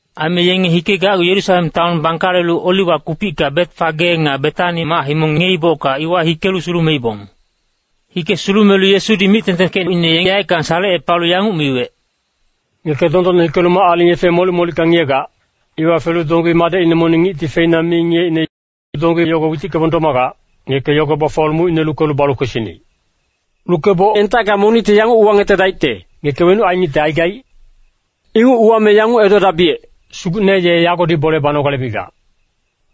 Aime yenge hikegacgu Yerusalem taon bangkalelu Oliwa kupicka Betfage nga Betani mac-himong ngiyeibocka iwa hikelu sulumeibong. Hike sulumelu Yesudi mic-tengtengkecine yaeckang salecepalu yanguc miwec, “Ngeke dondonne hikelu mac-aling yefe molic-molicka ngiyegac, iwa felu donggi madecine monic ngicti feina mi ngiyeicne. Donggi yogo witickebong domagac, ngeke yogo bafuwalu mucine lukelu balu kwesinic. Lukeboc entacka monicti yanguc uwangetedaicte, ‘Ngeke wenuc ainicte aigaic?’ Inguc uwame yanguc edodabiyec, ‘Sugucne ye yagodi bole banogale migac.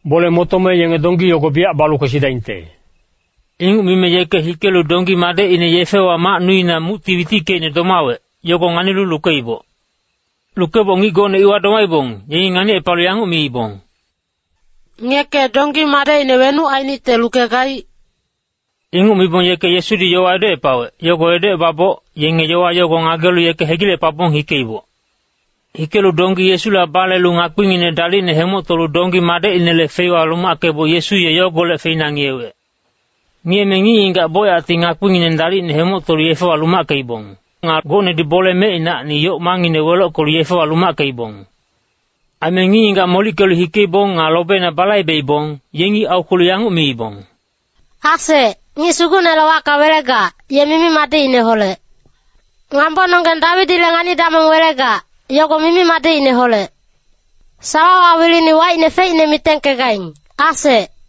Bole motome yenge donggi yogo biyac balu kwesidaingte.’” Inguc mime yeke hikelu donggi madecine yefewa mac nuina mucti witickeicne domawec, yogo nganilu lukeiboc. Lukeboc ngic gocne iwa domaibong, yengi nganicepalu yanguc miibong, “Ngeke donggi madecine wenuc ainicte lukegaic?” Inguc mibong yeke Yesudi yowa edocepawec, yogo edocebaboc, yenge yowa yogo ngagelu yeke hegilecepabong hikeiboc. Hikelu donggi Yesula balelu ngakpinginec dalicne hemoctolu donggi madecinele feiwa lumackeboc Yesu ye yogolec feina ngiyewec. Ngiyeme ngic-ngigac bocyacti ngakpingineng dalicne hemoctolu yefewa lumackeibong. Nga gocnedi bole mecinacni yoc mangngine welockelu yefewa lumackeibong. Aime ngic-ngigac molickelu hikeibong nga lobeina balaibeibong, yengi aukwelu yanguc miibong, “Asec, ngic Sugucnele wacka welegac, ye mimi-madicineholec. Ngambononggeng Dawidile ngani-damong welegac, yogo mimi-madicineholec. Sawawa wilini wacine feicne mitengkegaing, asec.”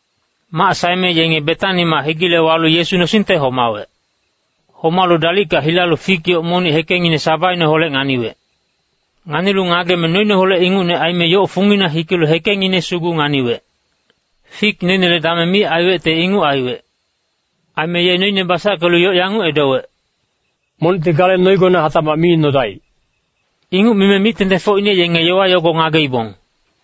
Mac saeme yenge Betani mac hegile walu Yesu nosingte homawec. Homalu dalicka hilalu fik yoc monic hekengngine sabaineholec nganiwec. Nganilu ngageme noineholec ingucne aime yoc fungina hikelu hekengngine sugu nganiwec. Fik noinele dameng mi aiwecte inguc aiwec. Aime ye noine basackelu yoc yanguc edowec, “Monicti gale noinegone hatacmac mi nodaic.” Inguc mime mic-tengtengfocine yenge yowa yogo ngageibong.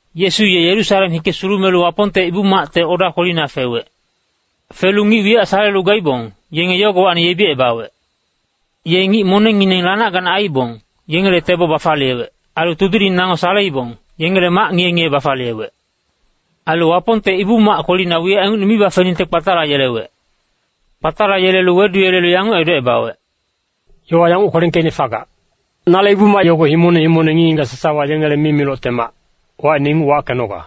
Yesu ye Yerusalem hike sulumelu Wapongte Ibu-macte oda kwelina fewec. Felu ngic wiyac salelu gaibong, yenge yogowacni yebicebawec. Ye ngic monengngineng lanac-ganac aiibong, yengele tebo bafaliyewec. Ailu tudiling nango saleibong, yengele mac ngiye-ngiye bafaliyewec. Ailu Wapongte Ibu-mac kwelina wiyac ingucne mi bafeningte kpatalayelewec. Kpatalayelelu weduyelelu yanguc edocebawec, “Yowa yanguc kwelengkeicne fagac, ‘Nale Ibu-mac yogo himongne himongne ngic-ngigac sasawa yengele mimilocte mac, wacine inguc wackenoga.’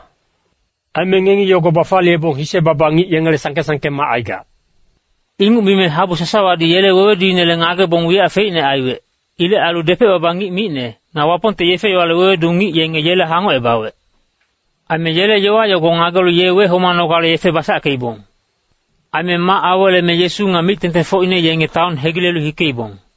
Aime ngengibac yogo bafaliyebong, ‘Hise-baba ngic yengele sangke-sangke mac aigac.’” Inguc mime habu sasawadi yele weweduinele ngagebong wiyac feicne aiwec. Ilec ailu depec-baba ngic micne, nga Wapongte yefe-yowale wewedu ngic yengi yele hangocebawec. Aime yele yowa yogo ngagelu ye wehomanogale yefe basackeibong. Aime mac aweleme Yesu nga mic-tengtengfocine yenge taon hegilelu hikeibong.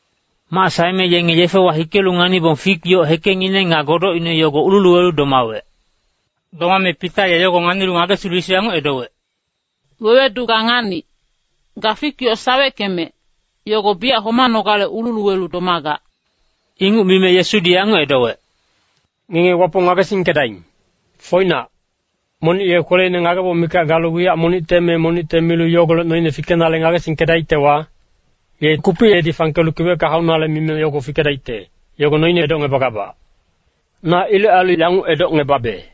Mac saeme yenge yefewa hikelu nganibong, fik yoc hekengngine nga godocine yogo ululuwelu domawec. Domame Pita ye yogo nganilu ngagesilu Yesu yanguc edowec, “Wewedu ga nganic, ga fik yoc saweckemec, yogo biyac homanogale ululuwelu domagac.” Inguc mime Yesudi yanguc edowec, “Ngenge Wapong ngagesingkedaing. Foinac, monic ye kweleina ngageboc mikac galu wiyac monicte me monicte milu yogolec noine fikenale ngagesingkedaictewa, ye kupic edi fangkelu kiwecka haunale mime yogo fikedaicte, yogo noine edocngebagabac. Na ilec ailu yanguc edocngebabe,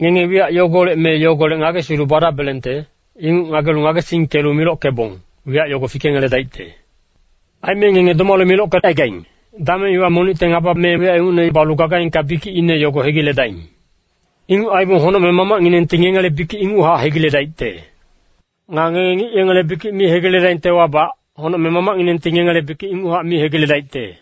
ngenge wiyac yogolec me yogolec ngagesilu badabelengte, inguc ngagelu ngagesingkelu milockebong, wiyac yogo fikengeledaicte. “Aime ngenge domalu milockecaigaing, dameng iwa monicte ngaba me wiyac ingucne balu gagaingka bikicine yogo hegiledaing. Inguc aibong honocmeng Mamacnginengti ngengele bikic inguchac hegiledaicte. [Nga ngenge ngic yengele bikic mi hegiledaingtewabac, honocmeng Mamacnginengti ngengele bikic inguchac mi hegiledaicte.]”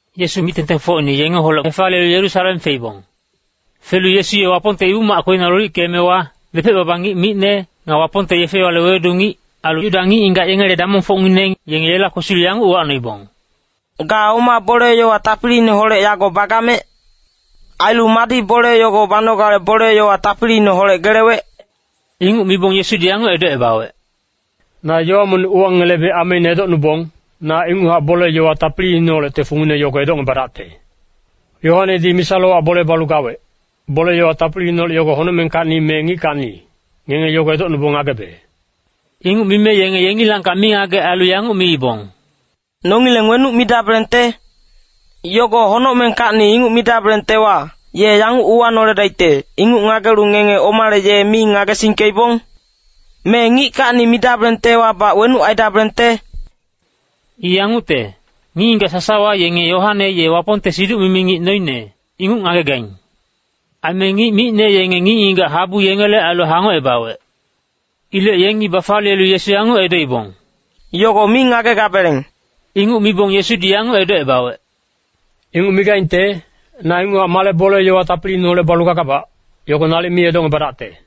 Yesu mic-tengtengfocine yengeholec hefaliyelu Yerusalem feibong. Felu Yesu ye Wapongte Ibu-mac kwelina lolickeemewa, depec-baba ngic micne, nga Wapongte yefe-yowale wewedu ngic, ailu Yuda ngic-ngigac yengele damongfocngineng, yenge yela kwesilu yanguc uwacnoibong, “Ga oma bole-yowa tapiliineholec yago bagamec? Ailu madi bole yogo banogale bole-yowa tapiliineholec gelewec?” Inguc mibong Yesudi yanguc edocebawec, “Na yowa monic uwangelebe ameine edocnubong, na inguchac bole-yowa tapiliineholecte fungine yogo edocngebadacte. Yoanedi misa-lowac bole balu gawec, bole-yowa tapiliineholec yogo honocmengkacni me ngickacni, ngenge yogo edocnubong ngagebe.” Inguc mime yenge yengilangkac mingagec ailu yanguc miibong, “Nongileng wenuc midabelengte? ‘Yogo honocmengkacni’ inguc midabelengtewa, ye yanguc uwanoledaicte, ‘Inguc ngagelubac ngenge omale ye mi ngagesingkeibong?’ Me ‘ngickacni’ midabelengtewabac wenuc aidabelengte?” I yangucte, ngic-ngigac sasawa yenge Yoane ye Wapongte siduc-mimi ngic noine, inguc ngagegaing. Aime ngic micne yenge ngic-ngigac habu yengele ailu hangocebawec. Ilec yengi bafaliyelu Yesu yanguc edoibong, “Yogo mi ngagegabeleng.” Inguc mibong Yesudi yanguc edocebawec, “Inguc migaingte, na inguchac male bole-yowa tapiliineholec balu gagabac, yogo nalic mi edocngebadacte.”